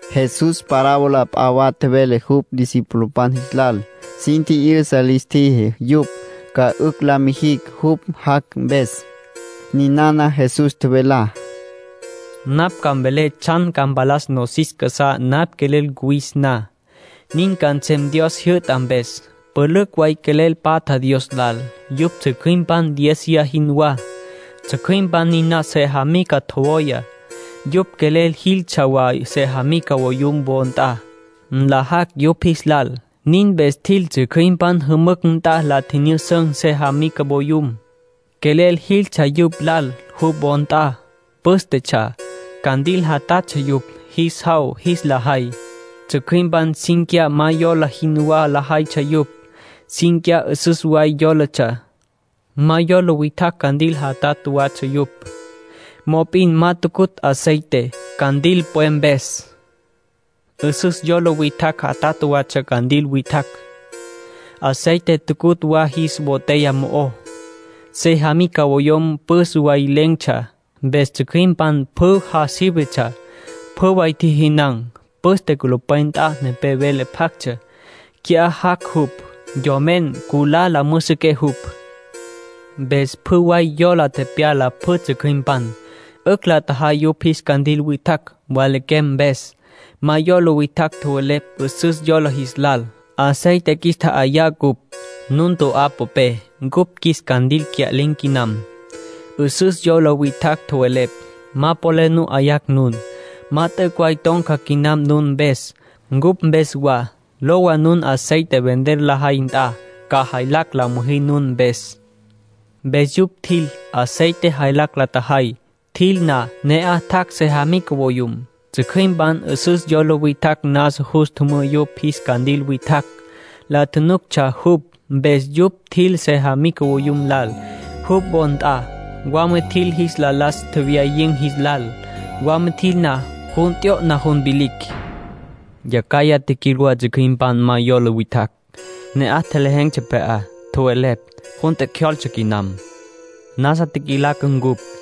Jesús parábola p'a wa tjevele jupj discipulopan jis lal. Sin tji'yüsa lis tjiji yupj ca 'ücj la mijicj jupj jac' mpes. Ninana Jesús tjevelá: —Napj ca mvelé tsjan ca mpalas nosis casá napj quelel cuwis na. Nin ca nsem Dios jyü'ta mpes. Pülücj way quelel patja Dios lal. Yupj tsjücjüimpan diéziya jinwá. Tsjücjüimpan niná sejamica tjowaya. Yupj quelel jiltsja wa sejamica voyum wo nt'a, nlajacj yupj jis lal. Nin mpes tjil tsjücjüimpan jümücj nt'a la nyüjüsün̈ sejamica voyum. Quelel jiltsja jupj lal, jupj wo nt'a. Pǘstetsja. Candil jatatsja yupj, jis jaw jis la jay. Tsjücjüimpan cínquiya ma yola jinwá lajaytsja yupj. Cínquiya 'üsüs way yólatsja. Ma yola witjacj candil jatatj watsja yupj. Mop'in ma tucutj aceite, candil pwe mpes. 'Üsüs yola witjacj jatatj watsja candil witjacj. Aceite tucutj wa jis botella mo'ó. Sejamica voyum püs way len̈tsja. Mpes tsjücjüimpan pjü ja sívetsja. Pjü way tjijinan̈. ”Püste culupwen nt'a nepé vele pjactsja: ‘Qui'á jac' jupj, yomen. Nculá la müjüsüqué jupj.’ Mpes pjü way yola tepyala pjü tsjücjüimpan. 'Ücj la tjajay yupj jis candil witjacj mwalaquem mpes. Ma yola witjacj tjowelepj 'üsüs yola jis lal: ‘Aceite qjuis tja'ayá ncupj, nun to'á popé. Cupj qjuis candil cya'lin̈ quinam.’ 'Üsüs yola witjacj tjowelepj: ‘Ma polel nu 'yayacj nun. Ma t'üc' way ton̈ca quinam nun mpes, ncupj mpes wa. Lowa nun aceite vender lajay nt'a. Ca jaylacj la müjí nun mpes.’ ”Mpes yupj tjil, aceite jaylacj la tjajay. Tjil na, ne'aj tjac' sejamica voyum. Tsjücjüimpan 'üsüs yola witjacj nasa jus tjümǘ yupj jis candil witjacj. La nuctsja jupj. Mpes yupj tjil sejamica voyum lal, jupj wo nt'a. Wama tjil jis la las tjewyayin̈ jis lal. Wama tjil na, jun t'yo'na jun vilicj. ”Yacjaya tjiquil wa tsjücjüimpan ma yola witjacj. Ne'aj lejen̈tsja pje'á. Tjowelepj: ‘Jun tjecjyoltse quinam. Nasa tjiquilaca ncupj.’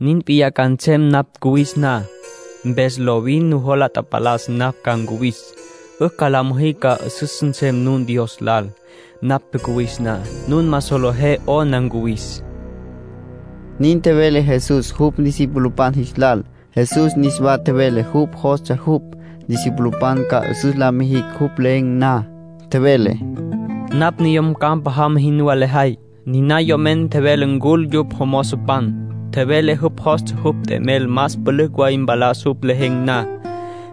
—Nin p'iyá ca nsem napj cuwis na —tjevele—. Mpes lovin nujola tapalas napj ca ncuwis. 'Ücj la müjí ca 'üsüs nsem nun Dios lal, napj cuwis na. Nun ma solejé 'ona ncuwis —nin tjevele Jesús jupj discipulopan jis lal. Jesús niswa tjevele jupj jostsja jupj discipulopan ca 'üsüs la mijicj jupj len̈ na. Tjevele: —Napj yom campa jama jinwá lejay. Niná yom tjevele ncul jupj jomozopan. Tjevele jupj jostsja jupj t'emel más pülücj way mpalas jupj len̈ na.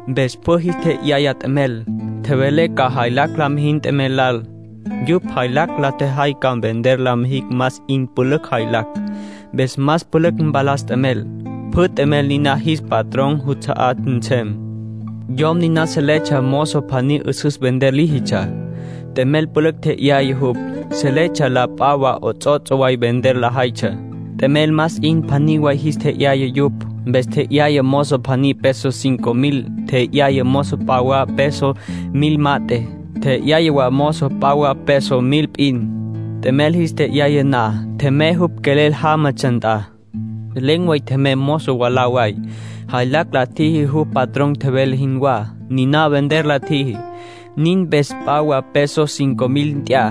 Mpes pjü jis tje'yaya t'emel. Tjevele ca jaylacj la mijicj t'emel lal. Yupj jaylacj la tjajay ca vender la mijicj más 'in pülücj jaylacj. Mpes más pülücj mpalas t'emel. Pjü t'emel niná jis patrón juts'a'á nsem. Yom niná seletsja mozo pjaní 'üsüs vender líjitsja. T'emel pülücj tje'yaya jupj. Seletsja la p'a wa 'ots'ots' way vender lajaytsja. T'emel más 'in pjaní way jis tje'yaya yupj. Mpes tje'yaya mozo pjaní peso cinco mil. Tje'yaya mozo p'a wa peso mil mat'e. Tje'yaya wa mozo p'a wa peso mil p'in. T'emel jis tje'yaya na, tjemey jupj quelel jámatsja nt'a. Len̈ way tjemey mozo mwalá way. Jaylacj la tjiji jupj patrón tjevele jinwá. Niná vender la tjiji. Nin mpes p'a wa peso cinco mil nt'ya,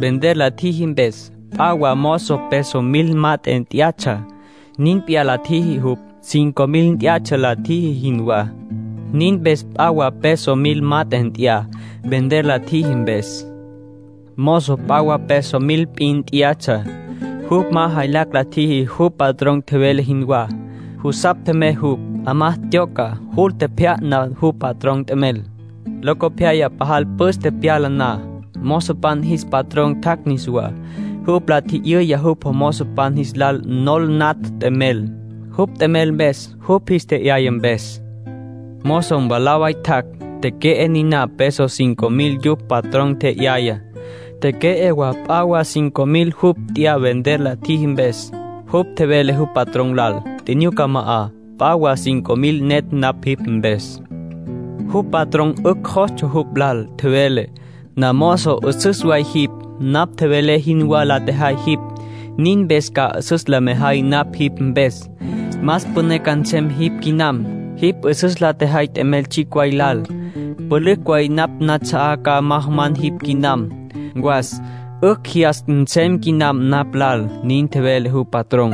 vender la tjiji mpes. P'a wa mozo peso mil mat'e tyá'atsja. Nin p'iyá la tjiji jupj, cinco mil tyá'atsja la tjiji jinwá. Nin mpes p'a wa peso mil mat'e nt'ya, vender la tjiji mpes. Mozo p'a wa peso mil p'in tyá'atsja. Jupj ma jaylacj la tjiji jupj patrón tjevele jinwá. Jusapj tjemey jupj. 'Amá tyoca, jul tjepjya'na jupj patrón t'emel. ”Locopyaya pajal püs tepyala na, mozopan jis patrón tjac' niswá. Jupj la tji'yüya jupj mozopan jis lal nol natj t'emel, jupj t'emel mpes, jupj jis tje'yaya mpes. Mozo mwalá way tjac'. Teque'e niná peso cinco mil jupj patrón tje'yayá. Teque'e wa p'a wa cinco mil jupj nt'ya vender la tjiji mpes. Jupj tjevele jupj patrón lal: ‘Tjinyuca ma'a. P'a wa cinco mil netj napj jipj mpes.’ ”Jupj patrón 'ücj jostsja jupj lal. Tjevele: ‘Namozo 'üsüs way jipj. Napj tjevelé jinwá la tjejay jipj. Nin mpes ca 'üsüs la mejay napj jipj mpes. Más püné ca nsem jipj quinam. Jipj 'üsüs la tjejay t'emel tsjicj way lal. Pülücj way napj nats'a'á ca majaman jipj quinam. Was, 'ücj jyas nsem quinam napj lal’, nin tjevele jupj patrón.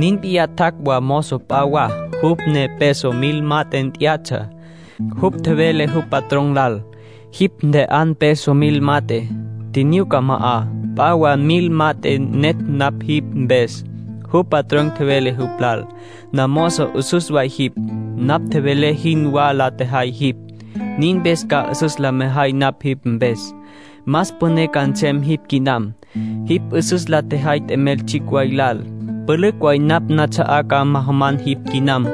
”Nin p'iyá tjac' wa mozo p'a wa, jupj ne peso mil mat'e tyá'atsja. Jupj tjevele jupj patrón lal: ‘Jipj ntje'an peso mil mat'e. Tjinyuca ma'a. P'a wa mil mat'e netj napj jipj mpes.’ ”Jupj patrón tjevele jupj lal: ‘Namozo 'üsüs way jipj. Napj tjevelé jinwá la tjejay jipj. Nin mpes ca 'üsüs la mejay napj jipj mpes. Más püné ca nsem jipj quinam. Jipj 'üsüs la tjejay t'emel tsjicj way lal. Pülücj way napj nats'a'á ca majaman jipj quinam.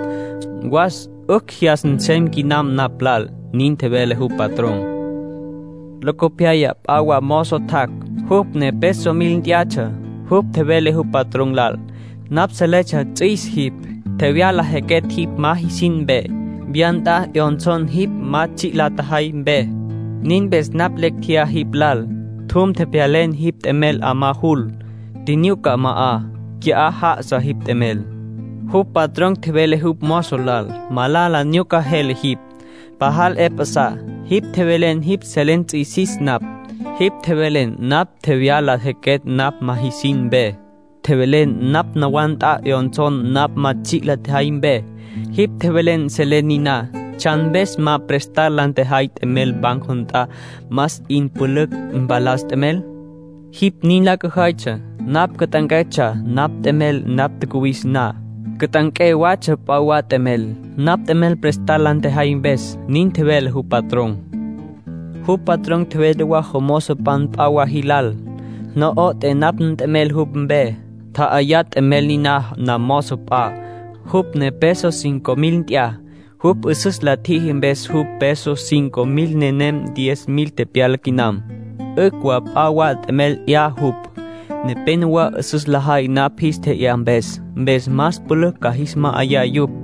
Was, 'ücj jyas nsem quinam napj lal’, nin tjevele jupj patrón. ”Locopyaya p'a wa mozo tjac', jupj ne peso mil tyá'atsja. Jupj tjevele jupj patrón lal: ‘Napj seletsja ts'üis jipj. Tjevyala jequetj jipj ma jisin mpe. Wya nt'a 'yonson jipj ma tsji' la tjejay mpe. Nin mpes napj lecj tjeyá jipj lal. Tjum, tjepjyalen jipj t'emel 'amá jul. Tjinyuca ma'a. Qui'á já'asa jipj t'emel.’ ”Jupj patrón tjevele jupj mozo lal: ‘Malala nyuca jele jipj. Pajal 'e pjasá. Jipj tjevelen jipj selen ts'üisis napj. Jipj tjevelen napj tjevyala jequetj napj ma jisin mpe. Tjevelen napj nawá nt'a 'yonsó napj ma tsji' la tjejay mpe. Jipj tjevelen selen niná. ¿Tsjan mpes ma prestar la tjejay nt'emel banco nt'a, más 'in pülücj mpalas t'emel? Jipj nin la cüjaytsja, napj cüt'anquetsja napj nt'emel napj tjacuwis na. Cüt'anqué watsja p'a wa t'emel, napj nt'emel prestar la tjejay mpes’, nin tjevele jupj patrón. ”Jupj patrón tjevele wa jomozopan p'a wa jis lal: ‘No'oté napj nt'emel jupj mpe. Tja'ayá t'emel niná namozo p'a, jupj ne peso cinco mil nt'ya. Jupj 'üsüs la tjiji mpes jupj peso cinco mil nenem diez mil tepyala quinam. 'Ücj wa p'a wa t'emel 'ya jupj. Nepénowa 'üsüs lajay napj jis tje'yá mpes. Mpes más pülücj ca jis ma'ayá yupj.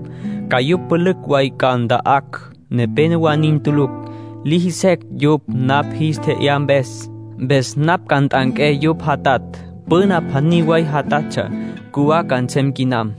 Ca yupj pülücj way ca nta'acj. Nepénowa nin tulucj. Liji secj yupj napj jis tje'yá mpes. Mpes napj ca nt'anqué yupj jatatj. Püna pjaní way jatatsja, cjuwá ca nsem quinam.’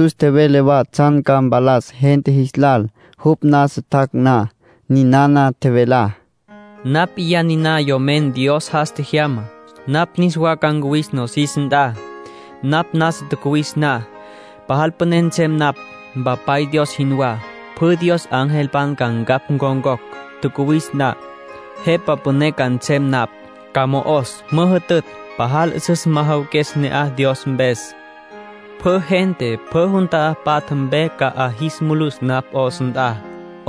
Jesús tjevele wa tsjan ca mpalas gente jis lal, jupj nasa tjac' na. Ninana tjevelá: —Napj p'iyá niná Yomen Dios jas tjejyamá. Napj niswa ca ncuwis nosis nt'a. Napj nasa tjacuwis na, pajal püné nsem napj, Mpapay Dios jinwá. Pjü Dios angelpan ca ncapj ncon̈cocj. Tjacuwis na, Jepa Püné ca nsem napj. Ca mo'os, müjütütj. Pajal 'üsüs majawaques ne'aj Dios mpes. Pjü gente pjü jun ta'á patja mpe ca 'a jis mulus napj 'os nt'a.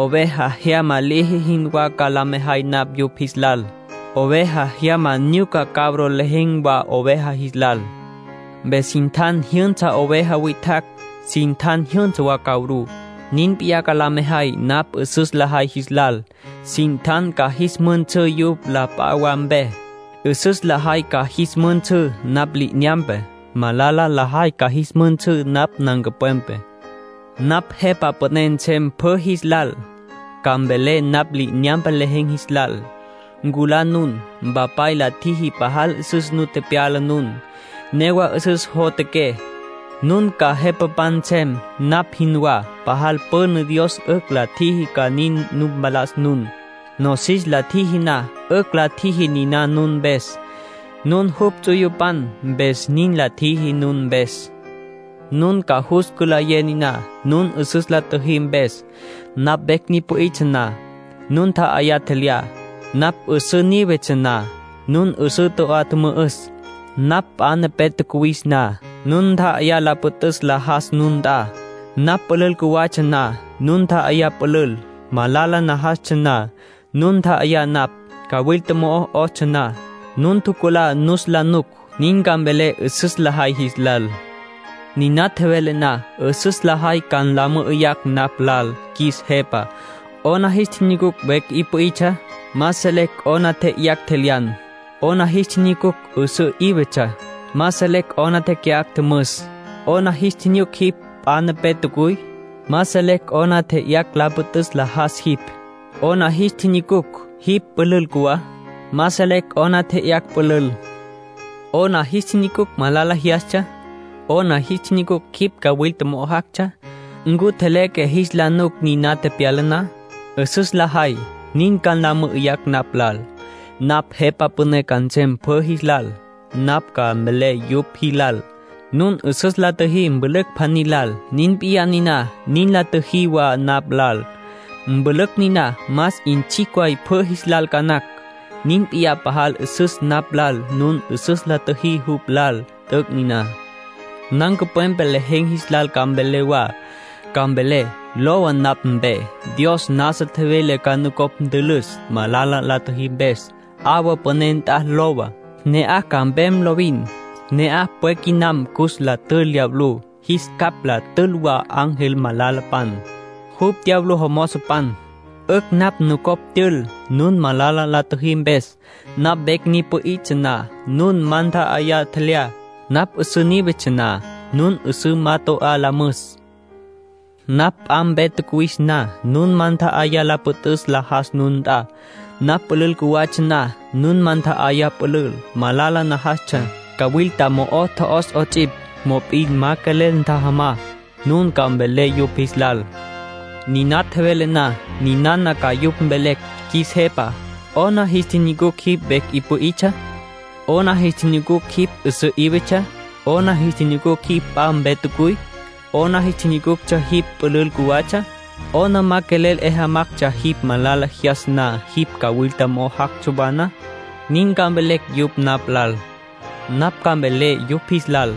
Oveja jyama liji jinwá ca la mejay napj yupj jis lal. Oveja jyama nyuca cabro lejen̈ wa oveja jis lal. Mpes sin tjan jyünsa oveja witjacj, sin tjan jyünsa wa cabrú. Nin p'iyá ca la mejay napj 'üsüs lajay jis lal. Sin tjan ca jis müjünsǘ yupj la p'a wa mpe. 'Üsüs lajay ca jis müjünsǘ napj li'inyampe. Malala lajay ca jis müjünsǘ napj nancupwepe. ”Napj Jepa Püné nsem pjü jis lal. Ca mvelé napj li'inyampe lejen̈ jis lal: ‘Nculá nun. Mpapay la tjiji pajal 'üsüs nu tepyala nun. Newa 'üsüs jotjaqué. Nun ca jepapan nsem, napj jinwá. Pajal püna Dios 'ücj la tjiji ca nin nu mpalas nun. Nosis la tjiji na, 'ücj la tjiji niná nun mpes. Nun jupj ts'uyupan, mpes nin la tjiji nun mpes. Nun ca jus cülayé niná, nun 'üsüs la tjüjí mpes. Napj vecj ni pü'itsja na, nun nta'ayá tjelyá. Napj 'üsǘ nívetsja na, nun 'üsǘ toco'á tjümü'üs. Napj p'a nepé tjacuwis na, nun ntja'ayá la püt'üs la jas nun nt'a. Napj pülül cjuwatsja na, nun nta'ayá pülül. Malala najastsja na, nun ntjajamá napj. Cawilta mo'o tjo'os na, nun tjuculá nus la nuc.’ Nin ca mvelé 'üsüs lajay jis lal. ”Niná tjevelé na, 'üsüs lajay ca nla mü'üyacj napj lal: ‘Qjuis Jepa, ¿'ona jis tjinyucucj vecj 'i pü'itsja? Ma selecj 'ona tje'yayacj tjelyan. ¿'Ona jis tjinyucucj 'üsǘ 'ívetsja? Ma selecj 'ona teque'acj tjümüs. ¿'Ona jis tjinyucucj jipj p'a nepé tjacuy? Ma selecj 'ona tje'yayacj la püt'üs la jas jipj. ¿'Ona jis tjinyucucj jipj pülül cjuwá? Ma selecj 'ona tje'yayacj pülül. ¿'Ona jis tjinyucucj malala jyastsja? ¿'Ona jis tjinyucucj jipj cawilta mo'o jactsja? ¿Ncu tjeleque jis la nuc niná tepyala na?’ 'Üsüs lajay nin ca nla mü'üyacj napj lal. ”Napj Jepa Püné ca nsem pjü jis lal. Napj ca mvelé yupj jis lal: ‘Nun 'üsüs la tjüjí mpülücj pjaní lal, nin p'iyá niná nin la tjüjí wa napj lal. Mpülücj niná más 'in tsjicj waytsja pjü jis lal ca nacj. Nin p'iyá pajal 'üsüs napj lal nun 'üsüs la tjüjí jupj lal. T'üc' niná.’ ”Nancupwepe lejen̈ jis lal ca mvelé wa. Ca mvelé: ‘Lowa napj mpe. Dios nasa tjevele ca nucopj ntülüs, malala la tjüjí mpes. 'Awa püné nt'a lowa, ne'aj ca mpem lovin. Ne'aj pwe quinam cus la tül diablú, jis capj la tül wa ángel malalapan. Yupj diablo jomozopan. 'Ücj napj nucopj tyül, nun malala la tjüjí mpes. Napj vecj ni pü'itsja na, nun ma nta'ayá tjelyá. Napj 'üsǘ nívetsja na, nun 'üsǘ ma toco'á la müs. Napj p'a mpe tjacuwis na, nun ma ntja'ayá la püt'üs la jas nun nt'a. Napj pülül cjuwatsja na, nun ma ntja'ayá pülül. Malala najastsja, cawilta mo'o tjo'os 'ots'ipj, mop'in ma quelel ntjajamá.’ Nin ca mvelé yupj jis lal. ”Niná tjevelé na, ninana ca yupj mvelecj: ‘Qjuis Jepa, ¿'ona jis tjinyucucj jipj vecj 'i pü'itsja? ¿'Ona jis tjinyucucj jipj 'üsǘ 'ívetsja? ¿'Ona jis tjinyucucj p'a mpe tjacuy? ¿'Ona jis tjinyucucj jipj pülül cjuwatsja? ¿'Ona ma quelel 'e jamactsja, jipj malala jyastsja na, jipj cawilta mo'o jactsja wa na?’ Nin ca mvelecj yupj napj lal. ”Napj ca mvelé yupj jis lal: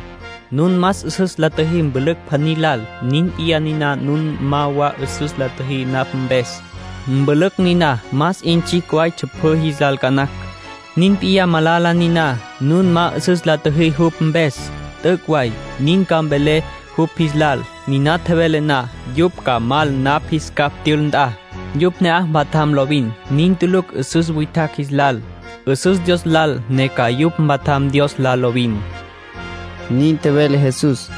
‘Nun ma 'üsüs la tjüjí mpülücj pjaní lal, nin p'iyá niná nun ma wa 'üsüs la tjüjí napj mpes. Mpülücj niná más 'in tsjicj waytsja pjü jis lal ca nacj. Nin p'iyá malala niná, nun ma 'üsüs la tjüjí jupj mpes. T'üc' way.’ Nin ca mvelé yupj jis lal. ”Niná tjevelé na, yupj ca mal napj jis capj tyül nt'a. Yupj ne'aj mpatjam lovin. Nin tulucj 'üsüs witjacj jis lal. 'Üsüs Dios lal ne ca yupj mpatjam Dios lal lovin —nin tjevele Jesús.